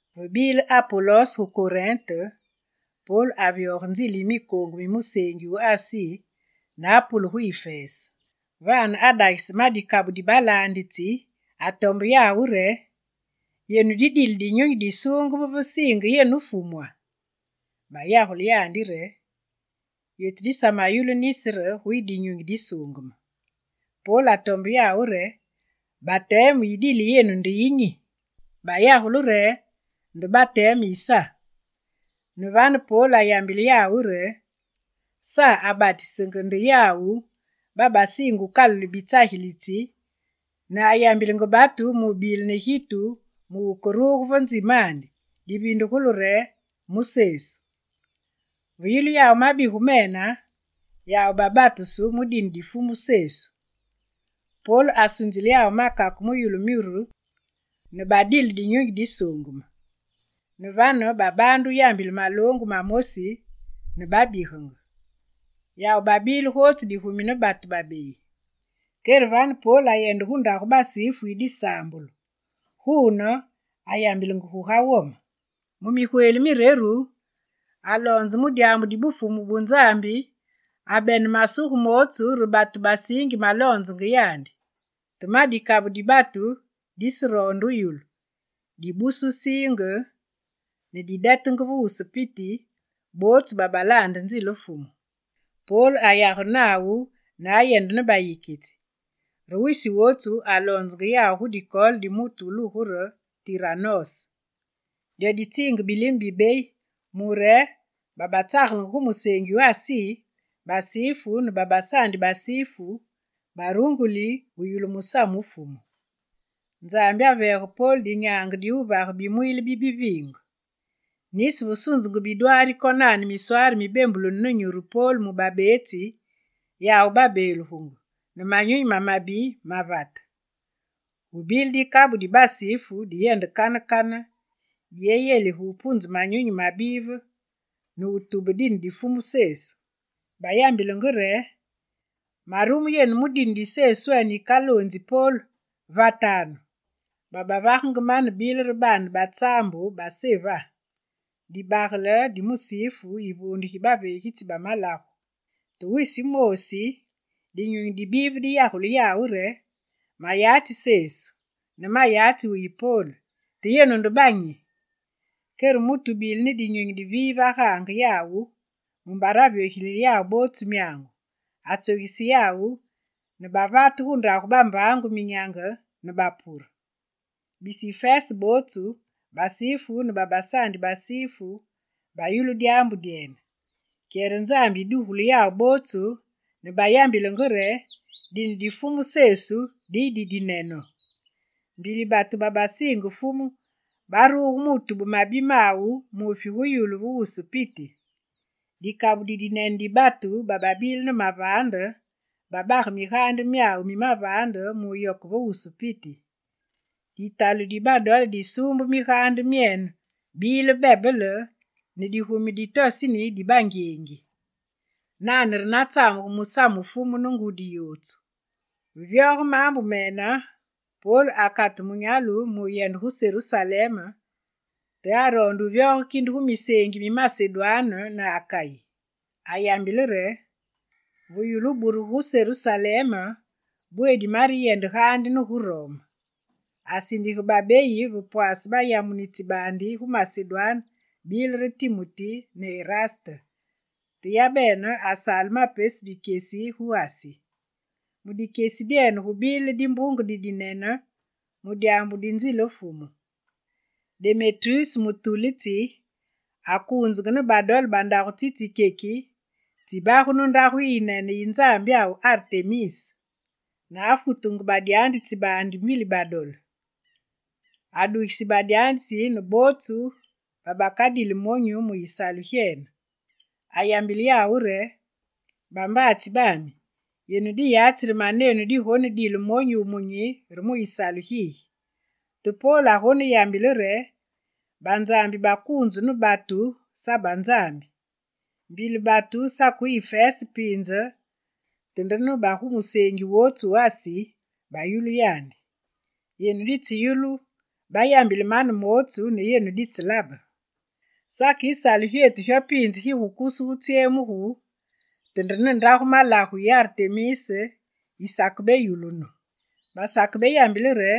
Ve bile Apolos gu Korinte, Pol avyoge nzile mikoongu mi museengi wu Asi ne apule gu Ifese. Vane, adagise ma dikabu di balaanditsi, atombe yawu re: «Yenu didile Dinyunyi Disuungeme ve siinge yenu Fumwa?» Bayagule yandi re: «Yetu disamayulu nisi re guyi Dinyunyi Disuungeme.» Pol atombe yawu re: «Bateme yidile yenu nde yi nyi?» Bayagule re: «Nde bateme yi Sa.» Ne vane, Pol ayambile yawu re: «Sa abatisenge nde yawu babasiinge wukalule bitsagilitsi, ne ayambilenge batu mu wubile ne gitu mu mutu wukeruge ve nzimandi, divindugulu re, mu Sesu.» Ve yulu mabigu mene, yawu babatusu mu dine di Fumu Sesu. Pol asunzile yawu makake mu yulu myuru ne badile Dinyunyi Disuungeme. Ne vane babaande wuyambile maloongu mamosi ne babigenge. Yawu babile gootsu digumi ne batu babeyi. Kere vane Pol ayende gu ndagu basifu yi disaambulu; guune, ayambilenge guga wome. Mu migweli mireru, aloonzenge mu dyaambu di Bufumu bu Nzambi, abene masuge mootsu re batu basiingi maloonzenge yandi. Te ma dikabu di batu diseroonde wuyulu, dibuse wusiinge ne didetenge ve wusu piti bootsu babalaande nzile Fumu. Pol ayagene nawu ne ayende ne bayikitsi, re wisi wootsu aloonzenge yawu gu dikoole di mutu wulugu re Tiranose. Dyo ditsiinge bilime bibeyi mure bootsu babatsagelenge gu museengi wu Asi, basifu ne babasaandi basifu, barunguli wuyulu musamu wu Fumu. Nzambi aveege Pol dinyaange di wuvage bimwiile bi biviinge. Nisi va sunzungu bidwaari konane miswaari mi bembulunu ne nyuru Pol mu babeetsi, yawu babeelugu ne manyunyi mamabi mavate. Gubile dikabu di basifu diyende kane kane, diyelige wupunze manyunyi mabive ne wutubenge dine di Fumu Sesu. Bayambilenge re: «Marume yenu mu dine di Seswene yikaloonzi Pol, vatanu!» Babavagenge mane bile re baane ba tsaambu ba Seva, dibagele di musifu, yivuunde gi baveegitsi ba malagu. Te wisi wumoosi, dinyunyi di bive diyagule yawu re: «Mayatsi Sesu, ne mayatsi wuyi Pol. Te yenu nde banyi?» Kere mutu wubile ne dinyunyi di bive agaange yawu mumbare avyogilile yawu bootsu myaangu. Atsogise yawu, ne bavate gu ndagu bambaangu, minyange, ne bapure. Bisi Ifese bootsu, basifu ne babasaandi basifu, bayulu dyaambu dyene. Kyere Nzambi yidugulu yawu bootsu ne bayambile re: «Dine di Fumu Sesu diyi didinene!» Mbili batu babasiinge Fumu, baruge mu wutube mabi mawu muufi gu yulu ve wusu piti. Dikabu didinene di batu bababile ne mavaande, babage migaande myawu mi mavaande mu wuyoke ve wusu piti. Ditalu di badole disuumbu migaande myene, bile bebele ne digumi di toseni di bangyengi. Nane re natsamugu musamu wu Fumu, ne ngudi yootsu. Ve vyoge maambu mene, Pol akate munyalu wuyende gu Serusalem, te aroonde wuvyoge kinde gu miseengi mi Masedwane ne Akayi. Ayambile re: «Va yulu wuburugu gu Serusalem, bweedi mareyende gaandi ne gu Rome.» Asindige babeyi va pwaase bayamunitsi baandi gu Masedwane, bile re Timuti ne Eraste, te yabene asaale ma pesu dikyesi gu Asi. Mu dikyesi dyene gubile dimbunge didinene, mu dyaambu di nzile Fumu. Demetruse mutulitsi akuunzenge ne badole, bandagu tsitsikyeki tsibagunu ndagu yi yinene yi nzambyawu Artemis, ne afutenge badyanzitsi baandi mbili badole. Adugise badyanzitsi ne bootsu babakadili monyu mu yisalu gyene. Ayambile yawu re: «Bambaatsi bami, yenu diyatsi re manenu digonedile monyu wumunyi re mu yisalu gigi. Te Pol agoneyambile re, banzambi bakuunzu ne batu sa banzambi. Mbili batu sake gu Ifese piinze, te nde ne ba gu museengi wootsu wu Asi bayulu yandi. Yenu ditseyulu bayambile mane mootsu ne yenu ditselabe. Sake yisalu gyetu gyo piinze gigukusugu wutsyemugu, te nde ne ndagu malagu yi Artemis yisakebeyulunu. Basakebeyambile re: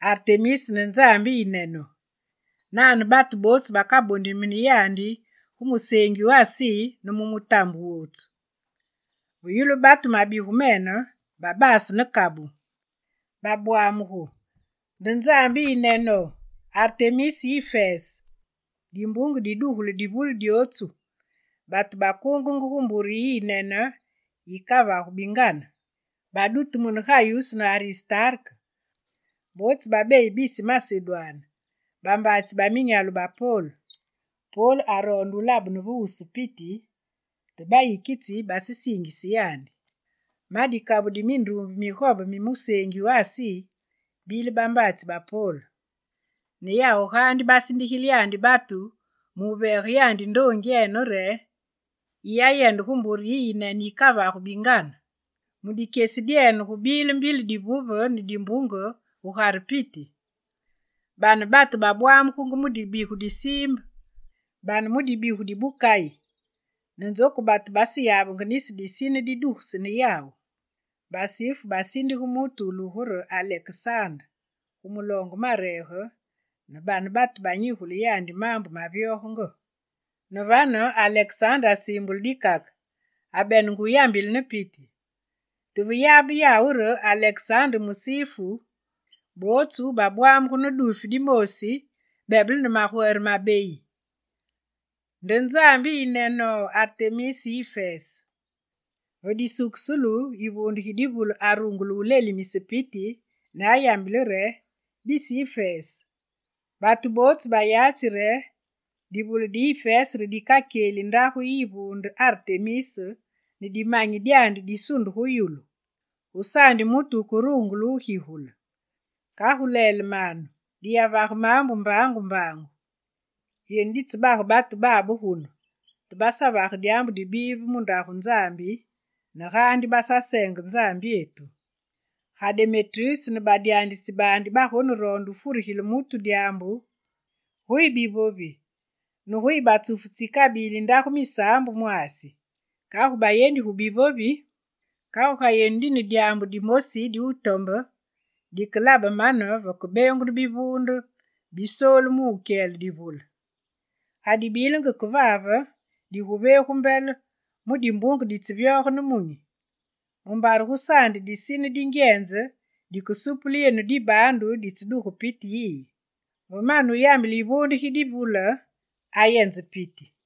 “Artemis nde nzambi yiyinene!”, nane batu bootsu bakabondimini yandi gu museengi wu Asi ne mu mutambe wootsu.» Ve yulu batu mabigu mene, babase ne kabu, babwamugungu: «Nde nzambi yiyinene, Artemis yi Ifese!» Dimbunge didugulu divule dyootsu, batu bootsu bakuunge gu mbure yiyinene yikavagu bingane. Badutumune Gayuse ne Aristarke, bootsu babeyi bisi Masedwane bambaatsi ba minyalu ba Pol. Pol aroonde wulabene ve wusu piti te bayikitsi basesiingise yandi. Ma dikabu di minduumbe migobe mi museengi wu Asi, bile bambaatsi ba Pol. Ne yawu gaandi basindigile yandi batu mu wuveege yandi ndoongyene re: «Yiyayende gu mbure yi yinene yikavagu bingane!» Mu dikyesi dyene, gubile mbili divuve ne dimbunge gugare piti. Bane batu babwamugenge mu dibigu di siimbe, bane mu dibigu di bukayi ne nzoku batu baseyabenge nisi disine di dugesene yawu. Basifu basindige mutu wulugu re Alekesande gu muloonge mareege ne bane batu banyigule yandi maambu mavyogenge. Ne vane Alekesande asiimbule dikake, abenenge wuyambile ne piti. Te veyabe yawu re Alekesande nde musifu, bootsu babwamugu ne duufi dimoosi, bebele ne magwere mabeyi: «Nde nzambi yiyinene, Artemis yi Ifese!» Ve disukusulu, yivuunde gi divule arungule wulelimise piti, ne ayambile re: «Bisi Ifese, batu bootsu bayatsi re divule di Ifese re dikakyeli ndagu yi yivuunde Artemis ne dimanyi dyandi disunde gu yulu. Gusaandi mutu wukerungule wugigule. Kagu lelemanu, diyavage maambu mbaangu mbaangu. Yenu ditsebage batu babe gunu, te basavage dyaambu dibive mu ndagu nzambi ne gaandi basaseenge nzambyetu. Ga Demetruse ne badyanzitsi baandi bagoneroonde wufurigile mutu dyaambu, guyi bivovi, ne guyi batsufu tsikabili ndagu misaambu mwaasi. Kagu bayendi gu bivovi! Te ga yenu dine dyaambu dimosi di wutombe, dike labe mane vakebeengunu bivuunde bisoolu mu wukyele divule. Ga dibilenge kevave diguveegu mbele mu dimbunge ditsevyoge nemunyi, mumbare gusaandi disine dingyenze dikesupule yetu dibaandu ditseduge piti yiyi.» Ve mane wuyambile yivuunde gi divule, ayenze piti.